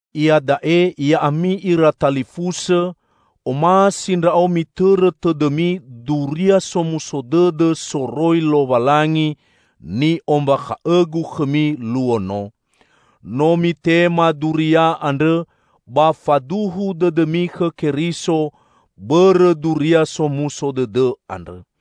Iada'e ya'ami ira talifusõ, omasi ndra'o mitõrõ tõdõmi Duria Somuso Dõdõ soroi Lowalangi ni'ombakha'õgu khõmi luo no. No mitema Duria andrõ ba faduhu dõdõmi khõ Keriso bõrõ Duria Somuso Dõdõ andrõ.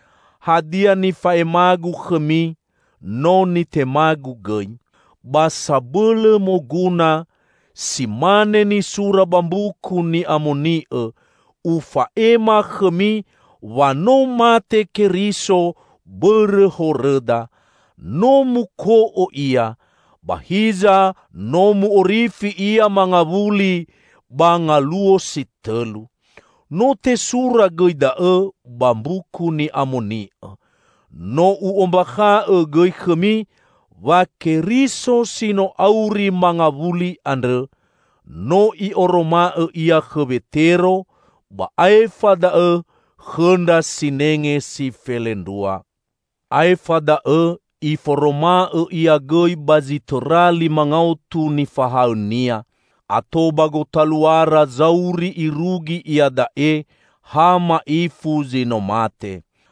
Hadia nifa'emagu khõmi no nitemagu gõi. Ba sabõlõ moguna, si mane nisura ba Mbuku Ni'amoni'õ, ufa'ema khõmi wa no mate Keriso bõrõ horõda; no muko'o Ia, ba hiza no mu'orifi Ia mangawuli ba ngaluo si tõlu. No tesura gõi da'õ ba Mbuku Ni'amoni'õ. No u'ombakhaõ gõi khõmi wa Keriso si no auri mangawuli andrõ, no I'oroma'õ Ia khõ Wetero, ba aefa daõ khõ ndra sinenge si felendrua. Aefa da'õ Iforoma'õ Ia gõi ba zi tõra lima ngaotu nifahaõ-Nia. Ato ba gotaluara zauri irugi iada'e, ha ma'ifu zi no mate.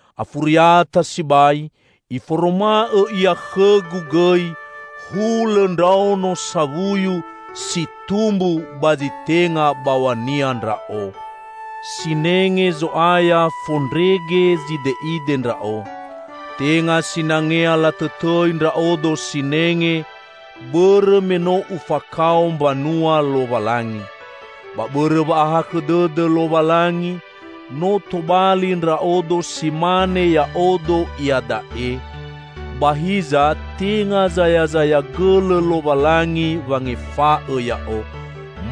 Afuriata sibai Iforoma'õ Ia khõgu gõi -- hulõ ndraono sawuyu si tumbu ba zi tenga baw̃ania ndra'o! Sinenge Zo'aya fondrege zide'ide ndra'o. Tenga sinangea latõtõi ndra'odo sinenge, bõrõ me no ufakao mbanua Lowalangi. Ba bõrõ wa'ahakhõ dõdõ Lowalangi no tobali ndra'odo si mane ya'odo iada'e. Ba hiza, tenga zayazaya gõlõ Lowalangi wangefa'õ ya'o.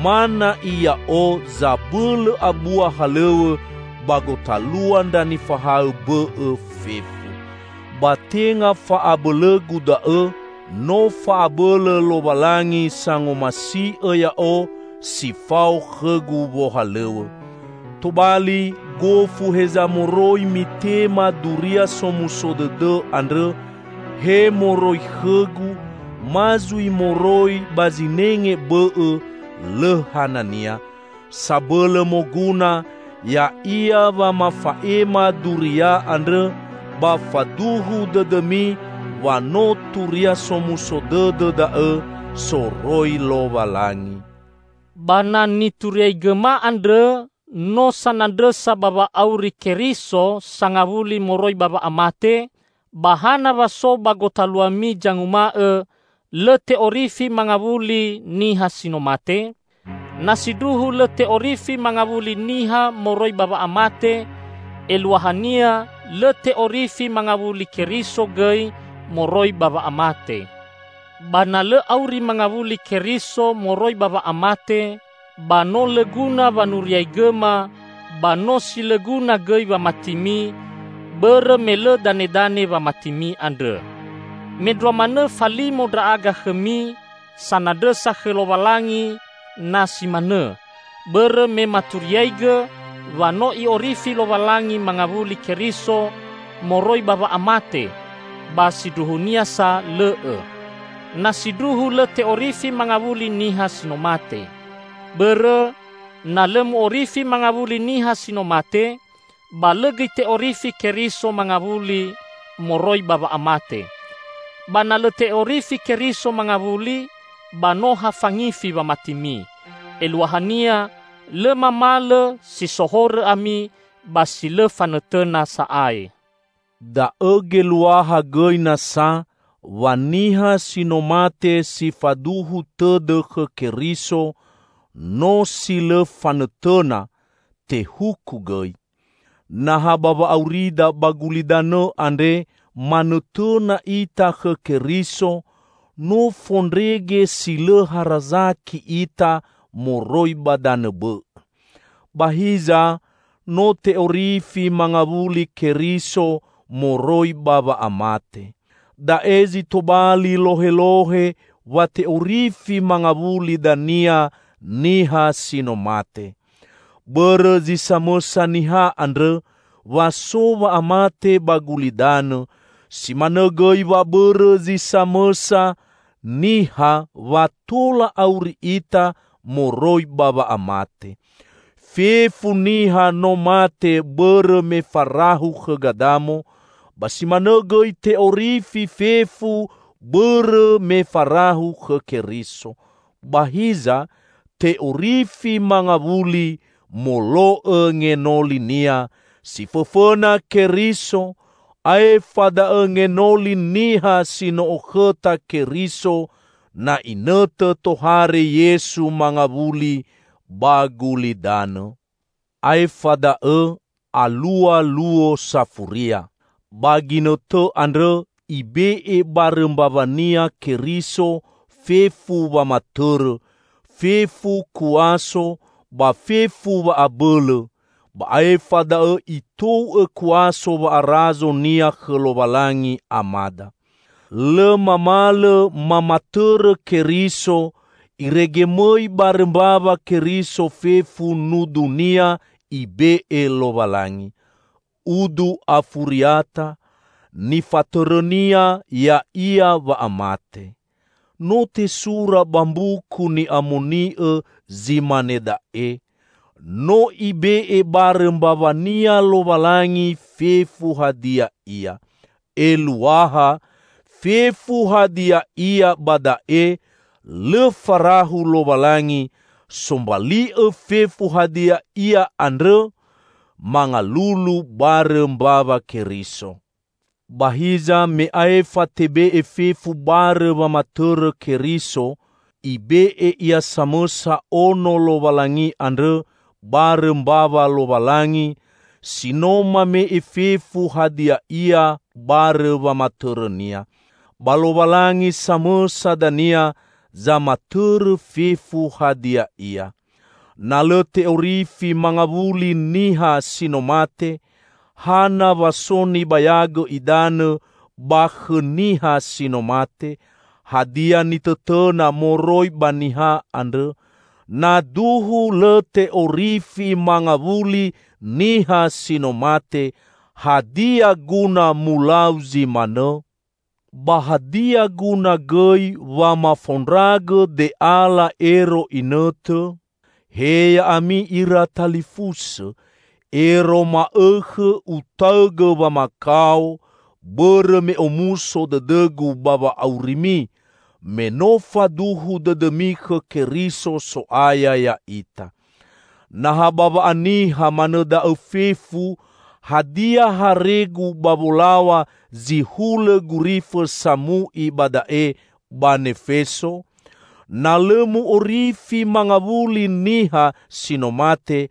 Ma na'i ya'o zabõlõ abua halõw̃õ ba gotalua ndra nifahaõ bõ'õ fefu. Ba tenga fa'abõlõgu da'õ; no fa'abõlõ Lowalangi sangomasi'õ ya'o si fao khõgu wohalõw̃õ. Tobali, gofu heza moroi mitema Duria Somuso Dõdõ andrõ -- he moroi khõgu ma zui moroi ba zinenge bõ'õ -- lõ hanania. Sabõlõ moguna ya'ia wa mafa'ema duria andrõ ba faduhu dõdõmi wa no Turia Somuso Dõdõ da'õ soroi Lowalangi. Ba na nituriaigõma andrõ no sanandrõsa ba wa'auri Keriso sangawuli moroi ba wa'amate, ba hana wa so ba gotaluami zanguma'õ lõ te'orifi mangawuli niha si no mate? Na sindruhu lõ te'orifi mangawuli niha moroi ba wa'amate, eluahania lõ te'orifi mangawuli Keriso gõi moroi ba wa'amate. Ba na lõ auri mangawuli Keriso moroi ba wa'amate, ba no lõ guna wanuriaigõma, ba no si lõ guna gõi wamatimi, bõrõ me lõ danedane wamatimi andrõ. Mendrua manõ falimo ndra'aga khõmi sanandrõsa khõ Lowalangi na si manõ, bõrõ me maturiaigõ wa no I'orifi Lowalangi mangawuli Keriso moroi ba wa'amate, ba sindruhunia sa lõ'õ -- na sindruhu lõ te'orifi mangawuli niha si no mate! Bõrõ, na lõ mu'orifi mangawuli niha si no mate, ba lõ gõi te'orifi Keriso mangawuli moroi ba wa'amate. Ba na lõ te'orifi Keriso mangawuli ba no ha fangifi wamatimi; eluahania lõ mamalõ si so horõ ami ba si lõ fanõtõna sa'ae. Da'õ geluaha gõi nasa wa niha si no mate si faduhu tõdõ khõ Keriso no si lõ fanõtõna, tehuku gõi. Na ha ba wa'aurida ba gulidanõ andre manõtõna ita khõ Keriso, no fondrege si lõ harazaki ita moroi ba danõ bõ'õ! Ba hiza, no te'orifi mangawuli Keriso moroi ba wa'amate. Da'e zi tobali lohelohe wa te'orifi mangawuli dania niha si no mate. Bõrõ zi samõsa niha andrõ wa so wa'amate ba gulidanõ, si manõ gõi wa bõrõ zi samõsa niha wa tola auri ita moroi ba wa'amate. Fefu niha no mate bõrõ me farahu khõ Gadamo, ba si manõ gõi te'orifi fefu, bõrõ me farahu khõ Keriso. Ba hiza, te'orifi mangawuli molo'õ ngenolinia: si fõfõna Keriso; aefa da'õ ngenoli niha si no okhõta Keriso, na inõtõ tohare Yesu mangawuli ba gulidanõ. Aefa da'õ alua luo safuria. Ba ginõtõ andrõ Ibe'e barõ mbawa-Nia Keriso fefu wamatõrõ, fefu kuaso ba fefu wa'abõlõ; ba aefa da'õ Itou'õ kuaso wa'arazo-Nia khõ Lowalangi, Amada. Lõ mamalõ mamatõrõ Keriso irege mõi barõ mbawa Keriso fefu nudu-Nia Ibe'e Lowalangi. Udu afuriata, nifatõrõ-Nia ya'ia wa'amate. No tesura ba Mbuku Ni'amoni'õ zi mane da'e, "No Ibe'e barõ mbawa-Nia Lowalangi fefu hadia ia." Eluaha "fefu hadia ia" ba da'e, lõ farahu Lowalangi, sombali'õ fefu hadia ia andrõ mangalulu barõ mbawa Keriso. Ba hiza me aefa tebe'e fefu barõ wamatõrõ Keriso, ibe'e Ia samõsa Ono Lowalangi andrõ barõ mbawa Lowalangi, si no mame'e fefu hadia ia barõ wamatõrõ-Nia. Ba Lowalangi samõsa dania zamatõrõ fefu hadia ia. Na lõ te'orifi mangawuli niha si no mate, hana wa so nibayagõ idanõ ba khõ niha si no mate? Hadia nitõtõna moroi ba niha andrõ? Na duhu lõ te'orifi mangawuli niha si no mate, hadia guna mulau zi manõ? Ba hadia guna gõi wa mafaondragõ de'ala ero inõtõ? He ya'ami ira talifusõ! Ero ma'õkhõ utaõgõ wamakao bõrõ me omuso dõdõgu ba wa'aurimi, me no faduhu dõdõmi khõ Keriso So'aya ya'ita. Na ha ba wa'aniha manõ da'õ fefu, hadia haregu ba wolow̃a zi hulõ gurifõ samu'i ba da'e, ba Nefeso? Na lõ mu'orifi mangawuli niha si no mate,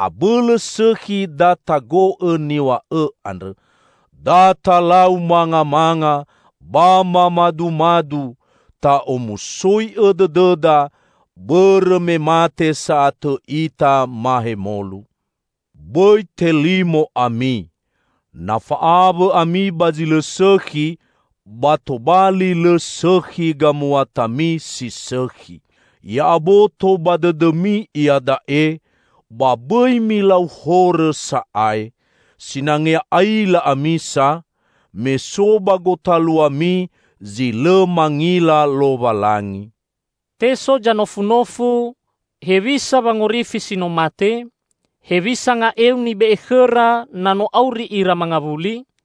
abõlõ sõkhi da tago'õ niw̃a'õ andrõ: "Da talau mangamanga ba mamadumadu, ta'omusoi'õ dõdõda, bõrõ me mate sa'atõ ita mahemolu." Bõi telimo ami! Na fa'awõ ami ba zi lõ sõkhi, ba tobali lõ sõkhi gamuatami si sõkhi. Ya'aboto ba dõdõmi iada'e, ba bõi milau horõ sa'ae. Sinangea aila ami sa, me so ba gotaluami zi lõ mangila Lowalangi. Te so zanofunofu, "Hewisa wangorifi si no mate? Hewisa nga'eu nibe'e khõra, na no auri ira mangawuli?"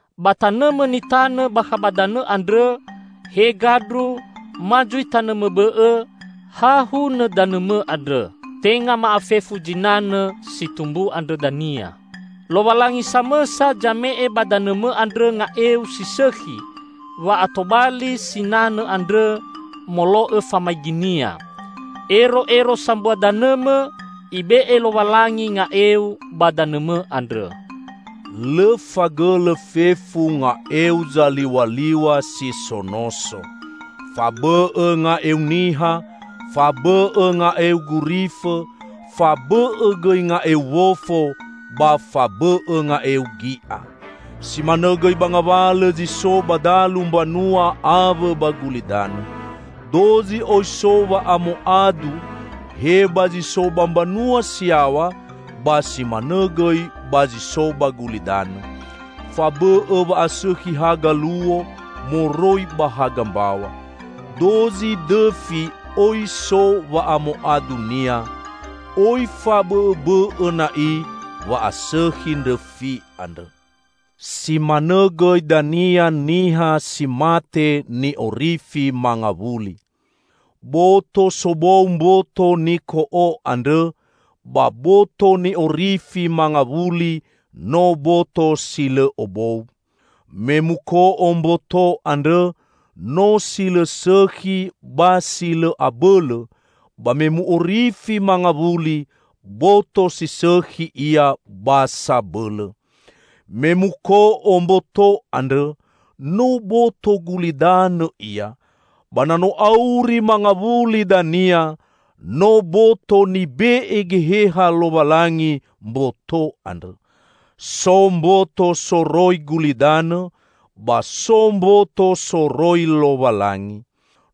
Ba tanõmõ nitanõ bakha ba danõ andrõ -- he gandru ma zui tanõmõ bõ'õ -- ha hunõ danõmõ andrõ, tenga ma'afefu zinanõ si tumbu andrõ dania. Lowalangi samõsa zame'e ba danõmõ andrõ nga'eu si sõkhi wa'atobali sinanõ andrõ molo'õ famaigi-Nia. Ero'ero sambua danõmõ, Ibe'e Lowalangi nga'eu ba danõmõ andrõ. Lõ fagõlõ fefu nga'eu zaliw̃aliw̃a si so noso. Fabõ'õ nga'eu niha, fabõ'õ nga'eu gurifõ; fabõ'õ gõi nga'eu wofo, ba fabõ'õ nga'eu gi'a. Si manõ gõi ba ngawalõ zi so ba dalu mbanua awõ ba gulidanõ. Dozi oi so wa'amoadu he ba zi so ba mbanua si yaw̃a, ba si manõ gõi ba zi so ba gulidanõ. Fabõ'õ wa'asõkhi haga luo moroi ba haga mbaw̃a. Dozi dõfi oi so wa'amoadunia. Oi fabõ'õbõ'õ na'i wa'asõkhi ndrõfi andrõ. Si manõ gõi dania niha si mate ni'orifi mangawuli. Boto sobou mboto niko'o andrõ; ba boto ni'orifi mangawuli no boto si lõ obou. Me muko'o mboto andrõ, no si lõ sõkhi ba si lõ abõlõ; ba me mu'orifi mangawuli, boto si sõkhi ia ba sabõlõ. Me muko'o mboto andrõ, no boto gulidanõ ia; ba na no auri mangawuli dania, no boto nibe'e Geheha Lowalangi mboto andrõ. So mboto soroi gulidanõ ba so mboto soroi Lowalangi.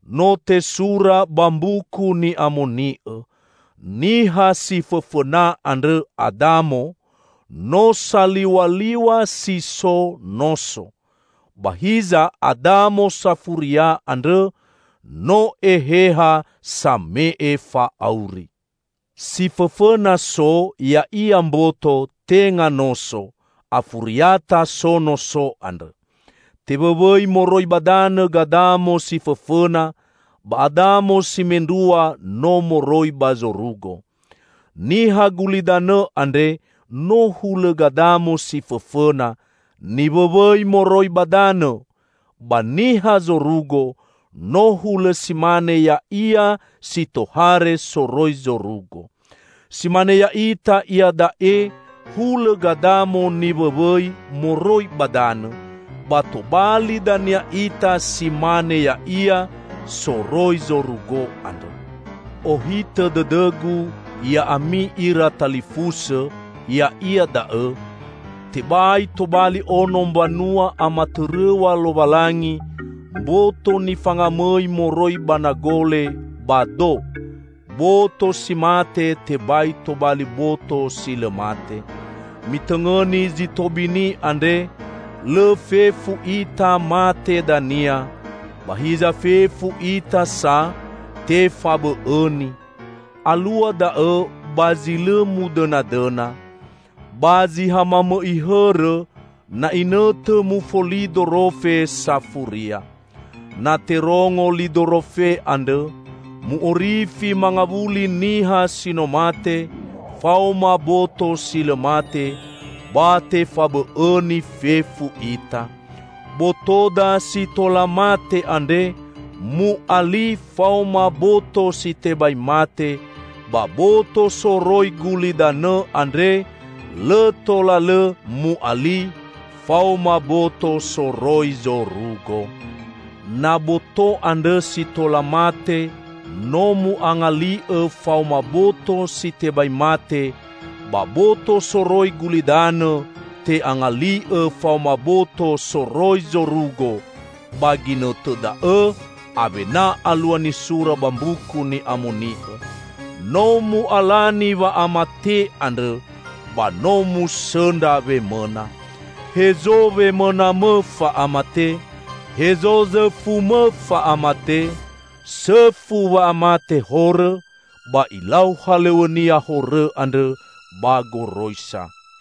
No tesura ba Mbuku Ni'amoni'õ, "Niha si fõfõna andrõ, Adamo, no saliw̃aliw̃a si so noso," ba hiza Adamo safuria andrõ no Eheha same'e fa'auri. Si fõfõna so ya'ia mboto, tenga noso. Afuriata so noso andrõ. Tewõwõi moroi ba danõ Gadamo si fõfõna, ba Adamo si mendrua no moroi ba zorugo. Niha gulidanõ andre no hulõ Gadamo si fõfõna, niwõwõi moroi ba danõ, ba niha zorugo, no hulõ si mane Ya'ia si tohare soroi zorugo. Si mane ya'ita iada'e hulõ Gadamo niwõwõi moroi ba danõ, ba tobali dania ita si mane Ya'ia soroi zorugo andrõ. Ohitõ dõdõgu, ya'ami ira talifusõ, ya'ia da'õ: tebai tobali ono mbanua amatõrõw̃a Lowalangi mboto nifangamõi moroi ba nagole ba do; boto si mate tebai tobali boto si lõ mate. Mitõngõni zi tobini andre: lõ fefu ita mate dania, ba hiza fefu ita sa tefabõ'õini. Alua da'õ ba zi lõ mudõnadõna, ba zi ha mamõ'i hõrõ, na inõtõ mufoli dorofe safuria. Na terongo li dorofe andrõ, mu'orifi mangawuli niha si no mate faoma boto si lõ mate, ba tefabõ'õini fefu ita. Botoda si tola mate andre mu'ali faoma boto si tebai mate, ba boto soroi gulidanõ andre lõ tola lõ mu'ali faoma boto soroi zorugo. Na boto andrõ si tola mate no mu'angali'õ faoma boto si tebai mate, ba boto soroi gulidanõ te'angali'õ faoma boto soroi zorugo, ba ginõtõ da'õ awena alua nisura ba Mbuku Ni'amoni'õ, "No mu'alani wa'amate andrõ; ba no musõndra wemõna!" "Hezo wemõnamõ, fa'amate? Hezo zõfumõ, fa'amate?" Sõfu wa'amate horõ, ba ilau halõw̃õnia horõ andrõ ba goroisa.